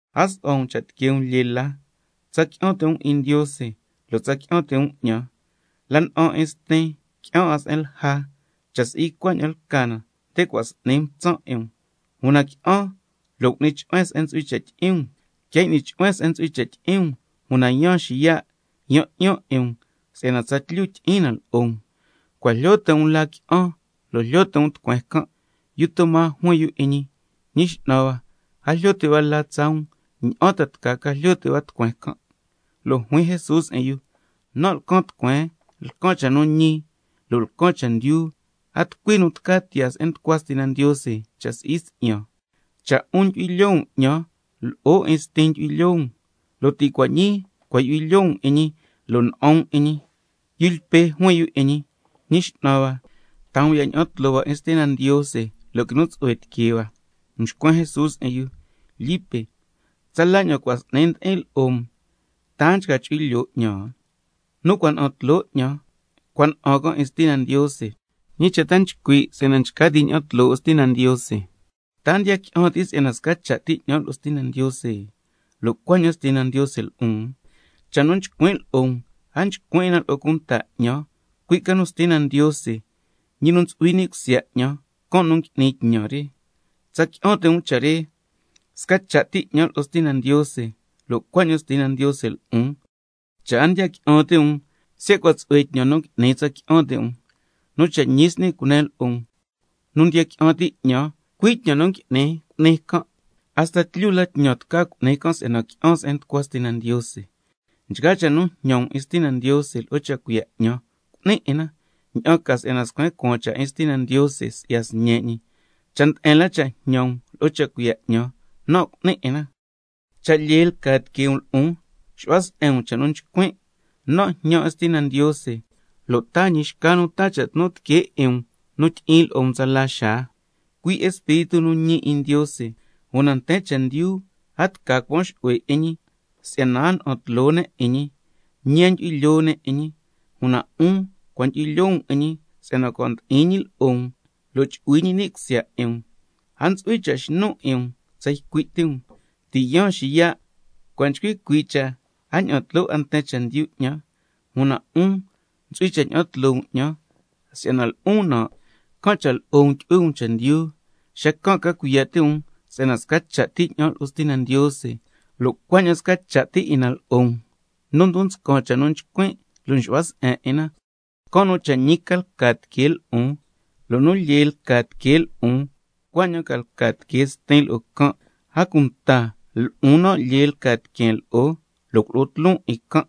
A su'hua um cha' tiquee um lyee la, tsa qui'an ti' um 'in Ndiose, lo' tsa qui'an ti' um 'ñan. La na'an 'in Stin, qui'an 'a se'en lja. Cha' si'i cuaña'an lca na, nde cua' s'ni mtsan' 'in um. Una qui'an, lo' cu'nin chu'huen se'en ntsu'hui cha' tyi'in um. Quia y'ni chu'huen se'en ntsu'hui cha' tyi'in um, una yaan xiya', yan 'yan 'in um si'yana tsatlyu tyi'in na lo'o um. Cua' jlyo ti' um la qui'an, lo' jlyo ti' um tucueen can'. Yu Toma juin yu 'in ñi: Ñi X'nan hua, a jlyo ti' hua la tsaa um, ¿ña'an ta ca jlyo ti' hua tucueen can'? Lo' juin Jesús 'in yu: Nan' lcan tucueen, lcan cha' nu ñi, lo' lcan chendyu. A tucui nu tca tiyaa se'en nducua Stina Ndiose, cha' si'i si'yan. Cha' 'un ndyu'hui lyoo um 'ñan, lo'o 'in Stin ndyu'hui lyoo um, lo' ti' cua' ñii cua' ndyu'hui lyoo um 'in ñi, lo' na'an um 'in ñi. Yu Lpe juin yu 'in ñi: Ñi X'nan hua, taa um ya' ña'an tloo hua 'in Stina Ndiose, lo' quinu tsu'hue tiquee hua. Mxcuen Jesús 'in yu: Lipe, tsala ña'an cua' s'ni ndi'in lo'o um, ¿ta a nchca chu'hui lyoo 'ñan? Nu cua' na'an tloo 'ñan, cua' na'an can' 'in Stina Ndiose. ¿Ñi cha' ta nchcui' si'yana nchca ti' ña'an tloo 'in Stina Ndiose? ¿Ta a ndiya qui'an ti' si'yana sca cha' ti 'ñan lo'o Stina Ndiose, lo' cuaña'an Stina Ndiose lo'on? Cha' nu nchcuin' lo'o um a nchcuin' 'in na lo'o cunta 'ñan, cui' ca nu Stina Ndiose, ñi nu ntsu'hui ni' cusya 'ñan, can' ñi nu ngui'ni tñan re. Tsa qui'an ti' um cha' re: Sca cha' ti 'ñan lo'o Stina Ndiose, lo' cuaña'an Stina Ndiose lo'on. Cha' a ndiya qui'an ti' um, siya' cua' tsu'hue tñan nu ngui'nin tsa qui'an ti' um. Nu cha' ñi s'ni cunen lo'o um: Nu ndiya qui'an ti' 'ñan, cui' tñan nu ngui'nin cu'ni can', hasta tlyu la tñan tca cu'ni can' si'yana qui'an se'en nducua Stina Ndiose. Nchgaa cha' nu jñan um 'in Stina Ndiose lo'o cha' cuiya' 'ñan, cu'nin 'in na, ña'an ca si'yana scuen cuaan cha' 'in Stina Ndiose si'ya Sñe' ñi. Cha' nde'en la cha' jñan um lo'o cha' cuiya' 'ñan, nan' cu'nin 'in na. Cha' lyee lca tiquee um lo'on, xu'hua se'en um cha' nu chcuin'. Nan' jñan 'in Stina Ndiose, lo' taa ñi xca nu taa cha' tnu tiquee 'in um nu tyi'in lo'o um tsala xaa, cui' Espíritu nu ñi 'in Ndiose, una nten chendyu a tca cuan xu'hue 'in ñi si'yana a ña'an tloo ne' 'in ñi, ñi a ndyu'hui lyoo ne' 'in ñi. Una 'un cua' ndyu'hui lyoo um 'in ñi si'yana cua' ndi'in ñi lo'o um, lo' chu'hui ñi ni' cusya 'in um. A ntsu'hui cha' xnun 'in um tsa ycui' ti um, si'yana ti' yaan xiya'. Cua' nchcui cuii' cha' a ña'an tloo 'a nten chendyu 'ñan, una 'un ntsu'hui cha' ña'an tloo um 'ñan. Si'yana lo'on nan', can' cha' lo'o um tu'hui um chendyu. Xacan' ca cuiya' ti' um si'yana sca cha' ti 'ñan lo'o Stina Ndiose, lo' cuaña'an sca cha' ti 'in na lo'o um. Nu ndon nscan cha' nu nchcuin' lo' nxu'hua se'en 'in na, can' nu cha' ñi ca lca tiquee lo'on, lo' nu lyee lca tiquee lo'on cuaña'an ca lca tiquee Stin lo'o can', a cunta lo'on nan' lyee lca tiqueen lo'o, lo' culo'on tloon 'in can'.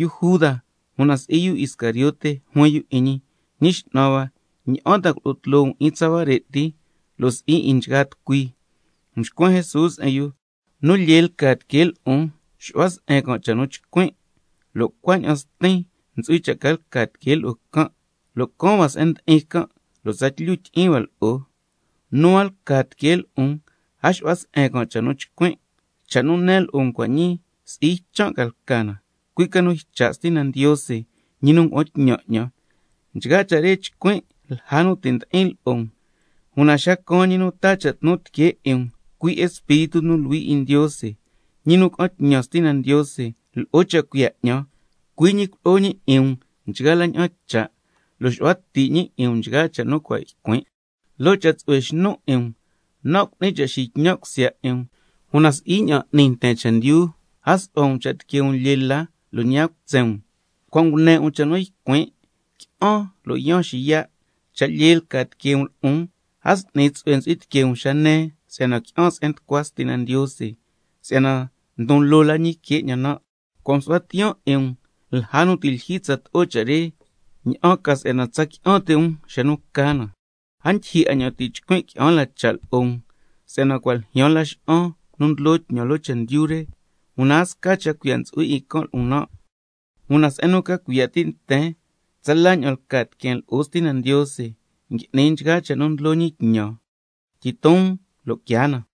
Yu Juda, (una si'i yu Iscariote) juin yu 'in ñi: Ñi X'nan hua, ¿ña'an ta culo'o tloo um 'in tsa huare' ti, lo' si'i 'in nchgaa tucui? Mxcuen Jesús 'in yu: Nu lyee lca tiquee lo'on, xu'hua se'en can' cha' nu nchcuin', lo' cuaña'an Stin ntsu'hui cha' ca lca tiquee lo'o can', lo' caan hua se'en ndi'in can' lo' tsatlyu tyi'in hua lo'o. Nu a lca tiquee lo'on, a xu'hua se'en can' cha' nu nchcuin'. Cha' nu nen lo'o um cua' ñii, si'i ychan' lca na, cui' ca nu ycha' Stina Ndiose, ñi nu ngua'an tñan 'ñan. Nchgaa cha' re nchcuin' lja nu ti' ndi'in lo'o um. Una xa caan ñi nu taa cha' tnu tiquee 'in um, cui' Espíritu nu Luhui 'in Ndiose, ñi nu ca'an tñan Stina Ndiose lo'o cha' cuiya' 'ñan, cui' ñi culo'o ñi 'in um nchgaa la ña'an cha', xu'hua ti' ñi 'in um nchgaa cha' nu cua' ycuin'. Loo cha' tsu'hue xnun 'in um, nan' cu'nin cha' tyi'in tsu'hue um, una si'i ña'an n'ni nten chendyu. A su'hua um cha' tiquee um lyee la, lo' ñi a cutsen um. Cua' ngune 'in um cha' nu ycuin': Qui'an, una yaan xiya'. Cha' lyee lca tiquee um lo'on, a s'ni tsu'hue ntsu'hui tiquee um xa nen si'yana qui'an se'en nducua Stina Ndiose, si'yana ndon loo la ñi que 'ñan nan'. Cua' msu'huan tiyaan 'in um lja nu ti' lyijyi tsato'o cha' re, ña'an ca si'yana tsa qui'an ti' um xa nu ca na. A ndyijyi ña'an ti' chcuin' qui'an la cha' lo'o um, si'yana cua' ljyaan laxa'an nu ndlo tñan loo chendyu re, una a sca cha' cuiya' ntsu'hui 'in can' lo'on nan'. Una se'en nu ca cuiya' ti' nten tsala ña'an lca tiqueen lo'o Stina Ndiose, can' cha' nchgaa cha' nu ndlo ñi tñan ngui'nin 'in na. Tyiton um, lo' quiaa na.